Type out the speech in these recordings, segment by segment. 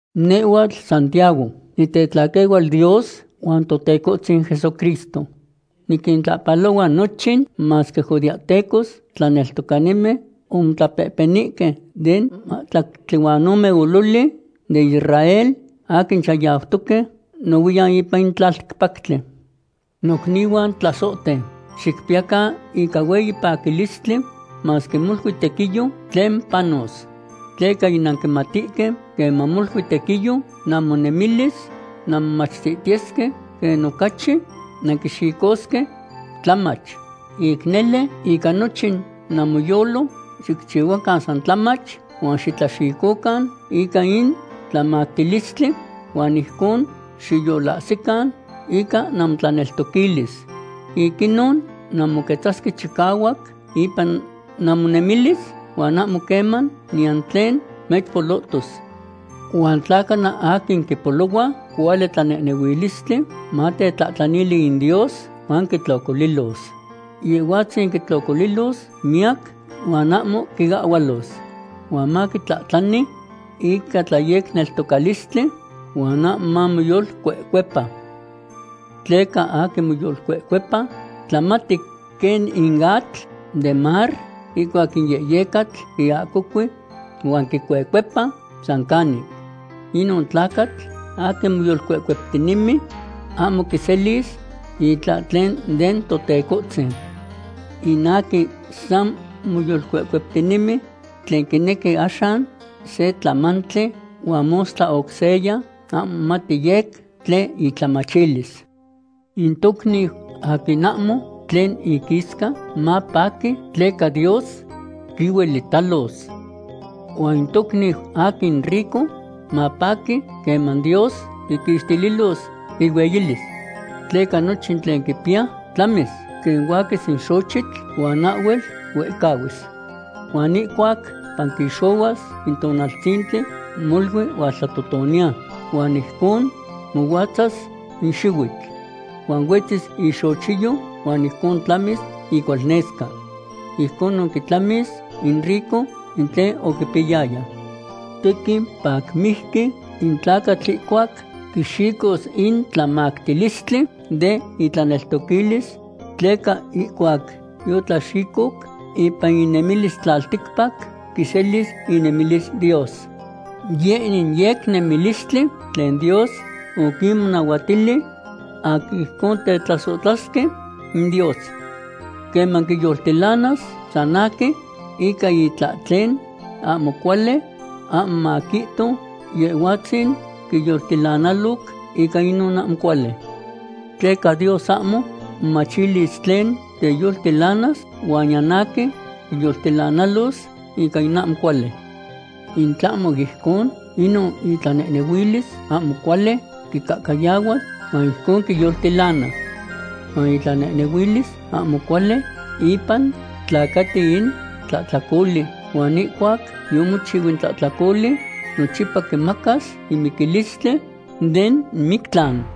Nehhuatl Santiago, nitetlaquehual Dios huan Totecohtzin Jesucristo. Niquintlahpalohua nochin masque judeahtecos tlaneltocanimen omotlapehpenihque den mahtlactli huan ome ololi den Israel aquin chayautoque nohuiyan ipan in tlalticpactli. Nocnihuan tlasohten, xicpiyacan ica hueyi paquilistli masque molui tequiyo tlen panos. Tleca yinanquimatihque queman molui tequiyo namonemilis, nanmomachtihtiyesque quen ocachi nanquixicosque tlamach. Ic nele, ica nochin namoyolo xicchiyacan san tlamach huan xitlaxicocan ica in tlamactilistli huan ijcon xiyolahsican ica namotlaneltoquilis. Ic inon nanmoquetzasque chicahuac ipan namonemilis huan ahmo queman niyan tlen mechpolotos. Huan tla cana aquin quipolohua cuali tlanehnehuilistli, matetlahtlanili in Dios huan quitlocolilos. Yehhuatzin quitlocolilos miyac huan ahmo quiahhualos. Huan maquitlahtlani ica tlayecneltocalistli huan ahmo mamoyolcuecuepa. Tleca aquin moyolcuecuepa tlamati quen in atl den mar ihcuac in yehyecatl quiahcocui huan quicuecuepa san canic. Inon tlacatl aquin moyolcuecueptinemi ahmo quiselis itlahtlen den Totecohtzin. In aquin san moyolcuecueptinemi, tlen quinequi axan se tlamantli huan mostla oc seya, ahmo momati yec tlen itlamachilis. In tocniu aquin ahmo tlen iquisca mapaqui tleca Dios quihuelitalos. Huan in tocniu aquin rico mapaqui queman Dios quiquixtililos ihueyilis. Tleca nochin tlen quipiya tlamis quen huaquis in xochitl, huan ahhuel huehcahuis. Huan ihcuac panquixohuas in tonaltzintli molui hualtlatotoniya huan ijcon mohuatzas in xihuitl. Huan huetzis ixochiyo huan ijcon tlamis icualnesca. Ijconon quitlamis in rico in tlen oquipiyayaya. Tequin pacmijqui in tlacatl ihcuac quixicos in tlamactilistli den itlaneltoquilis, tleca ihcuac yotlaxicoc ipan inemilis tlalticpac, quiselis inemilis Dios. Yeh in yecnemilistli tlen Dios oquinmonahuatili aquin ijcon tetlasohtlasque in Dios. Queman quiyoltilanas san aquin ica itlahtlen ahmo cuali, ahmo maquihto Yehhuatzin oquiyoltilanaloc ica inon ahmo cuali. Tleca Dios ahmo momachilis tlen teyoltilanas huan niyan aquin quiyoltilanalos ica in ahmo cuali. In tlahmo ijcon, inon itlanehnehuilis ahmo cuali quicahcayahuas huan ijcon quiyoltilana. Huan itlanehnehuilis ahmo cuali ipan tlacati in tlahtlacoli, huan ihcuac yomochiu in tlahtlacoli, nochipa quimacas in miquilistli den mictlan.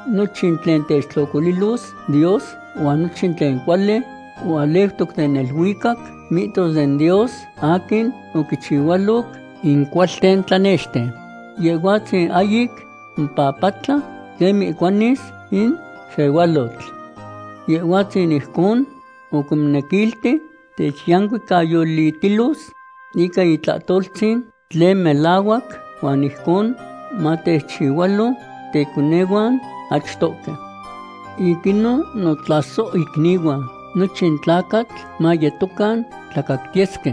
Nochin in tlen techtlocolilos Dios huan nochin tlen cuali hualeutoc den neluicac, mihtos den Dios aquin oquinchihualoc in cuahcualten tlanexten. Yehhuatzin ahyic mopapatla quen mihcuanis in sehualotl. Yehhuatzin ijcon oquimonequilti techyancuicayolitilos ica itlahtoltzin tlen melahuac, huan ijcon matechchihualo teconehuan achtohque. Ic inon, notlasohicnihuan, nochin tlacatl mayetocan tlacactiyesque.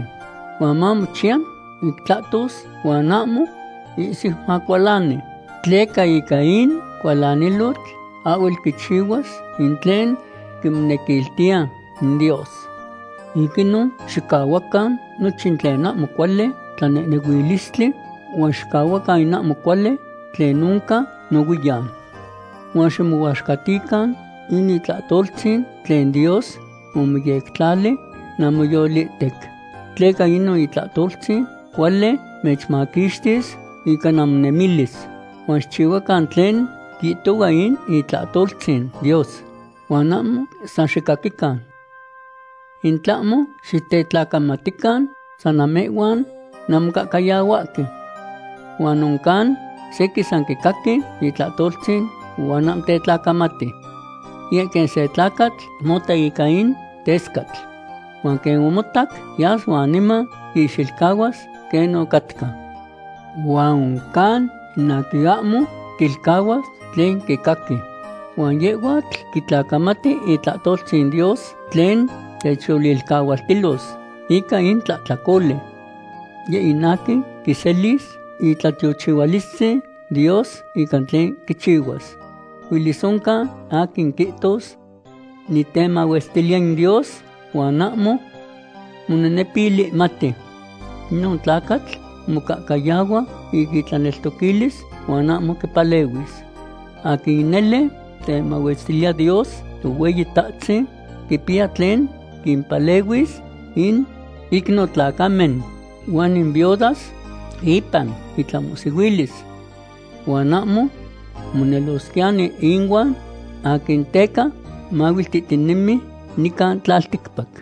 Huan mamochiya ic tlahtos, huan ahmo ihsiu macualani. Tleca ica in cualanilotl ahhuel quichihuas in tlen quimonequiltiya in Dios. Ic inon xicahuacan nochin tlen ahmo cuali tlanehnehuilistli, huan xicahuacan in ahmo cuali tlen oncan nohuiyan. Huan ximohuaxcatican in itlahtoltzin tlen Dios omoyectlali namoyolihtec. Tleca inon itlahtoltzin cuali mechmaquixtis ica namonemilis. Huan xicchihuacan tlen quihtohua in itlahtoltzin Dios, huan ahmo san xicaquican. In tlahmo xitetlacamatican san namehhuan nanmocahcayahuahque. Huan oncan sequin san quicaqui itlahtoltzin huan ahmo tetlacamati. Yeh in quen se tlacatl mota ica in tescatl. Huan quen omotac, yas huan niman quixilcahuas quen ocatca. Huan oncan in aquin ahmo quilcahuas tlen quicaqui. Huan yehhuatl quitlacamati itlahtoltzin Dios tlen techyolilcahualtilos ica in tlahtlacoli. Yeh in aquin quiselis itlatiochihualistzin Dios ica tlen quichihuas. Huelis oncan aquin quihtos: “Nitemahuestiliya in Dios”, huan ahmo monenepilihmati. Inon tlacatl mocahcayahua ica itlaneltoquilis huan ahmo quipalehuis. Aquin nele temahuestiliya Dios Tohueyitahtzin quipiya tlen quimpalehuis in icnotlacamen huan in viudas ipan intlamohsihuilis. Huan ahmo monelosquiyani ihuan aquin teca mahuiltihtinemi nican tlalticpac.